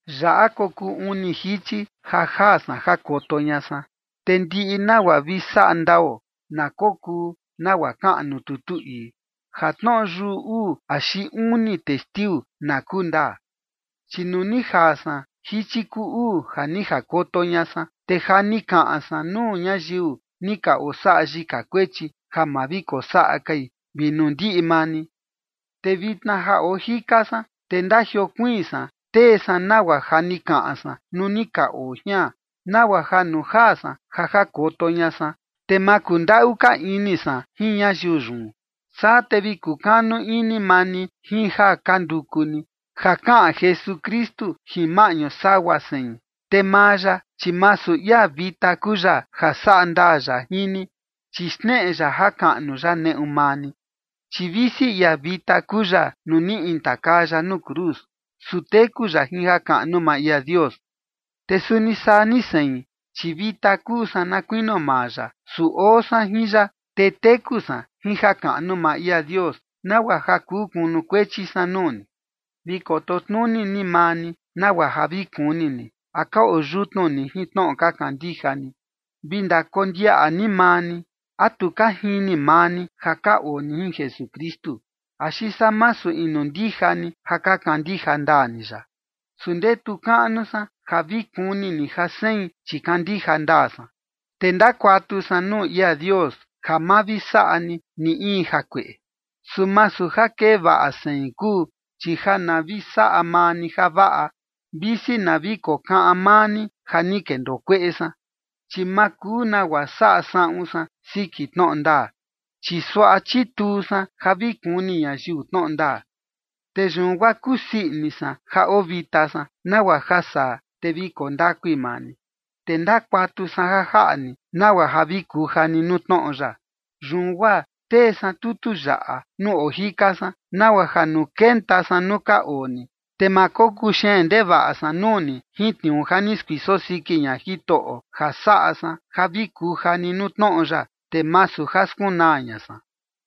Yaꞌa kokuu uni jichi ja jaa san jakoto ña san. Te ndiꞌi nagua vi saꞌa ndao na kokuu nagua kaꞌan nuu tutu ii, ja tnoꞌo yuꞌu uu axi uni testiu na kuu ndaa. Chi nuu ni jaa san jichi kuu uu ja ni jakoto ña san, te ja ni kaꞌan san nuu ñayiu ni ka osaꞌa yika kuechi ja ma vi kosaꞌa kai vi nuu ndiꞌi maa ni. Te vitna ja oo jika san, te ndajiokuiin san tee san nagua ja ni kaꞌan san nuu ni ka oo jian, nagua ja nuu jaa san ja jakoto ña san, te ma kundaꞌu ka ini san jin ñayiu yun. Saa te vi kukanu ini maa ni jin ja ka nduku ni, ja kaꞌan Jesukristu jin maꞌñu sagua sein. Te maa ya, chi masu ia vita kuu ya ja saꞌa ndaa ya jin ni, chi xneꞌe ya jakaꞌnu ya neꞌu maa ni. Chi visi ia vita kuu ya nuu ni intakaa ya nuu cruz, su teku ya jin jakaꞌnu maa ia Dios. Te suni saa ni sein, chi vita kuu san na kuinio maa ya. Su oo san jin ya, te teku san jin jakaꞌnu maa ia Dios, nagua ja kuu kunukuechi san nuu ni. Vi koto tnuni ni maa ni nagua ja vi kuni ni, a ka oo yutnu ni jin tnoꞌo ka kandija ni. Vi ndakondiaꞌa ni maa ni, ¿a tu ka jini maa ni ja ka oo ni jin Jesukristu? Axi saa masu inu ndija ni ja ka kandija ndaa ni ya. Su ndetu kaꞌnu san ja vi kuni ni ja sein, chi kandija ndaa san. Te ndakuatu san nuu ia Dios ja ma vi saꞌa ni ni in jakueꞌe, su masu ja kee vaꞌa sein kuu, chi ja na vi saꞌa maa ni javaꞌa, visi na vi kokaꞌan maa ni ja ni kendoo kueꞌe san. Chi ma kuu nagua saꞌa saꞌun san siki tnoꞌo ndaa, chi suaꞌa chituu san ja vi kuni ñayiu tnoꞌo ndaa. Te yun guaa kusii ini san ja oo vita san, nagua ja saa, te vi koo ndakui maa ni. Te ndakuatu san ja jaꞌa ni, nagua ja vi kuja ni nuu tnoꞌo ya. Yun guaa tee san tutu yaꞌa nuu oo jika san, nagua ja nuu kenta san nuu ka oo ni, te ma kokuu xeen ndevaꞌa san nuu ni jin tniuu ja ni skuiso siki ña Jitoꞌo ja saꞌa san ja vi kuja ni nuu tnoꞌo ya, te masu ja skunaa ña san.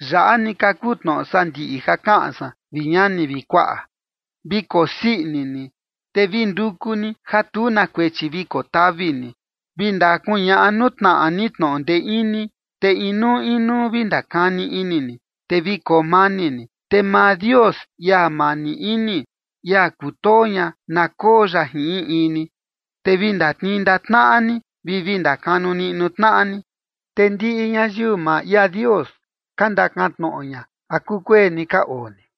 Yaꞌa ni ka kuu tnoꞌo sandiꞌi ja kaꞌan san, vi ñani vi kuaꞌa. Vi kosii ini ni, te vi nduku ni ja tu na kuechi vi kotavi ni, vi ndakuñaꞌa nuu tnaꞌa ni tnoꞌo ndee ini, te inuu inuu vi ndakani ini ni, te vi koo mani ni. Te maa Dios, ia mani ini, ia kutoo ña, na koo ya jin in in ni. Te vi ndatnii ndaꞌa tnaꞌa ni vi vi ndakanu niꞌnu tnaꞌa ni. Te ndiꞌi ñayiu maa ia Dios ka ndakan tnoꞌo ña, ¿a kukueni ka oo ni?